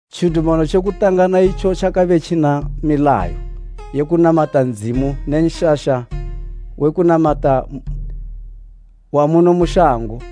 Tjidumano tje kutanga naitjo tjakabe tjina milayo ye kunamata Ndzimu ne nshasha we kunamata wa muno mu shango.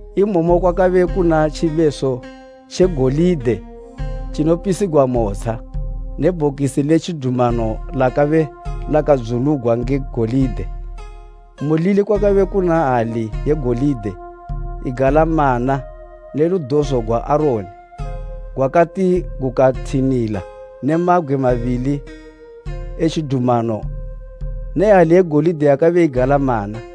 Imomo kwakabe kuna tjibeso tje golide tjinopisigwa motsha ne Bhokisi le Tjidumano lakabe lakadzulugwa nge golide, mulili kwakabe kuna hali ye golide igala mana ne ludozo gwa Aroni gwakati gukathinila ne mabgwe mabili e tjidumano ne hali ye golide yakabe igala mana.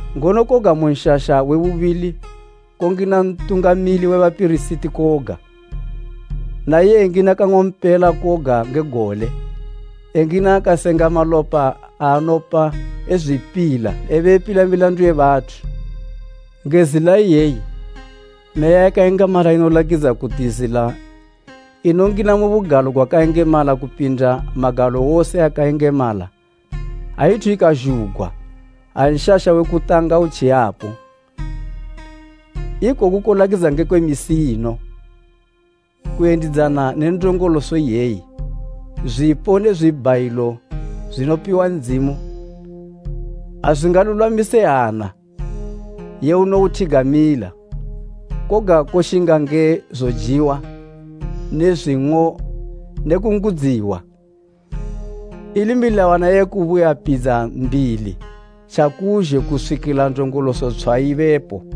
Ngono koga mu nshasha we bubili kongina Ntungamili we bapirisiti koga, naiye engina kang'ompela koga nge gole, engina akasenga malopa aanopa ezwipila ebe epila milandu ye bathu. Nge zila iyeyi Meya yakayengemala inolakidza kuti zila inongina mu Bugalo gwakayengemala kupindisa ayithu ikazhugwa, ha nshasha we kutanga utji yapo. Ikoku kolakidza ngekwe misi ino. Kuyendidzana ne ndongoloso iyeyi, zwipo ne zwibhayilo zwinopiwa Ndzimu azwingalulwamise hana ye unouthigamila, koga koshinga nge zojiwa ne zwing'o ne kungudziwa, ili milawana ye kubuyapidza mbili tjakuzhe kuswikila ndongoloso tshwa ibepo.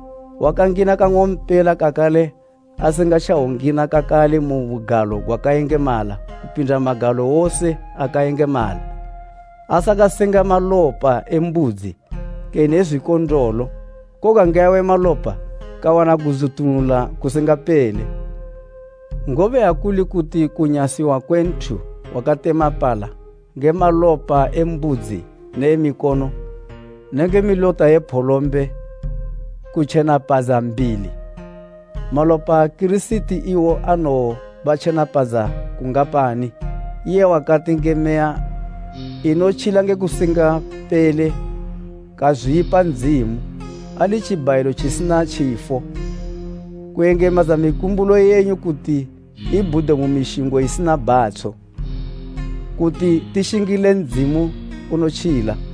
wakangina kang'ompela kakale asingatjowongina kakale mu Bugalo gwakayengemala kupinda magalo wose akayengemala asakasenga malopa e mbudzi kene e zwikondolo, koga nge awe malopa kawana kudzutunula kusingapele. Ngobe ha kuli kuti kunyasiwa kwe nthu wakatemapala nge malopa e mbudzi ne e mikono nenge milota ye pholombe kutjenapadza mbili; malopa a Kirisiti iwo anowobatjenapadza kungapani iye wakati nge Meya inotjila nge kusingapele kazwipa Ndzimu, ali tjibhayilo tjisina tjifo, kuyengemadza mikumbulo yenyu kuti ibhude mu mishingo isina bhatsho, kuti tishingile Ndzimu unotjila.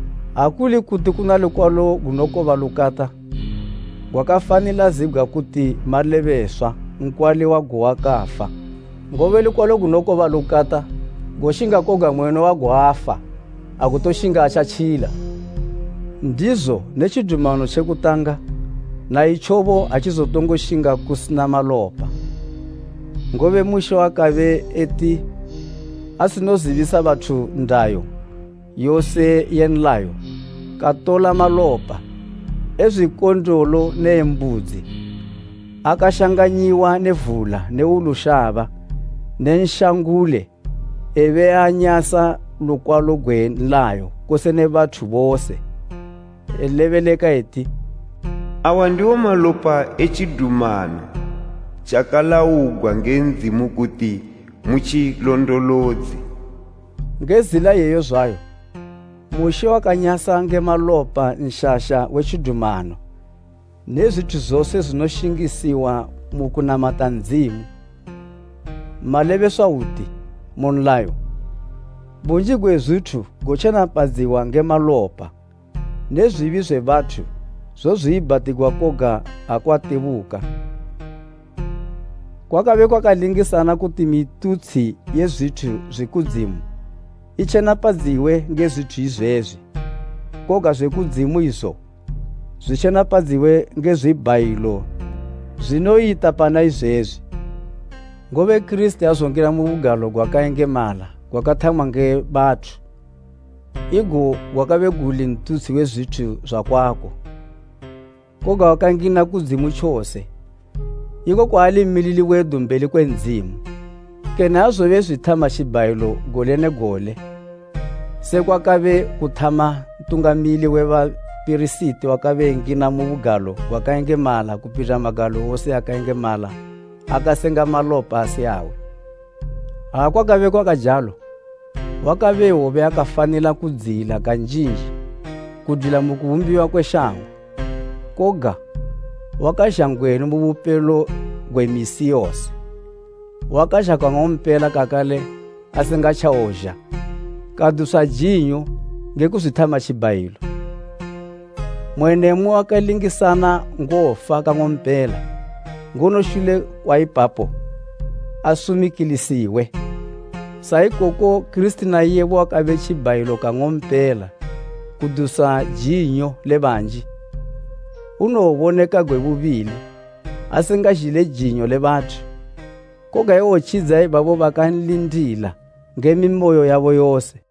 Ha kuli kuti kuna lukwalo gunokoba lukata, kwakafanila zibgwa kuti malebeswa nkwali wago wakafa; ngobe lukwalo gunokoba lukata goshinga koga mweni wago afa, agutoshinga atjatjila. Ndizo ne tjidumano tje kutanga na itjobo atjizotongoshinga kusina malopa. Ngobe Mushe wakabe eti asinozibisa bathu ndayo yose ye nlayo, katola malopa e zwikondolo ne e mbudzi akashanganyiwa ne vula ne wulu shaba ne nshangule ebe eanyasa lukwalo gwe nlayo kose ne bathu bose. Elebeleka eti, “Awa ndiwo malopa e tjidumano tjakalaugwa nge Ndzimu kuti mu tjilondolodze.” Nge zila iyeyo zwayo, Mushe wanyasa malopa Nshasha we Tjidumano ne zwithu zose zwinoshingisiwa mu kunamata Ndzimu. Malebeswa hwuti, mu nlayo, bunji gwe zwithu gotjenapadziwa nge malopa ne zwibi zwe bathu zozwiibhatigwa koga ha kwatebuka malopa. Kwakabe kwakalingisana kuti mitutshi ye zwithu zwi kudzimu itjenapadziwe nge zwithu izwezwi, koga zwe kudzimu izo, zwitjenepadziwe nge zwibhayilo zwinoyita pana izwezwi. Ngobe Kirisiti aazongina mu bugalo gwakayengemala gwakathamwa nge bathu, igo gwakabe guli ntutshi we zwithu zwakwako. Koga wakangina kudzimu tjose iko kwaali mmilili wedu mbeli kwe Ndzimu. Kene aazobe ezwithama tjibhayilo gole ne gole, sekwakabe kuthama Ntungamili we bapirisiti wakabe engina mu Bugalo gwakayengemala kupinda magalo wose akayengemala akasenga malopa asi awe. Ha kwakabe kwakajalo wakabe ewobe akafanila kudziyila kanjinji kudwila mu kubumbiwa kwe shango. Koga, wakazha ngwenu mu bupelo gwe misi yose, wakazha kang'ompela kakale asingatjawozha, kadusa jinyo nge kuzwithama tjibhayilo. Mmwe ne mmwe wakalingisana ngofa kang'ompela, ngono shule kwa ipapo asumikilisiwe. Sa ikoko Kirisiti na iyebo wakabe tjibhayilo kang'ompela kudusa jinyo le banji. Unowoboneka gwe bubili, asingazhile jinyo le bathu, koga ewotjidza ibabo bakanlindila nge mimoyo yabo yose.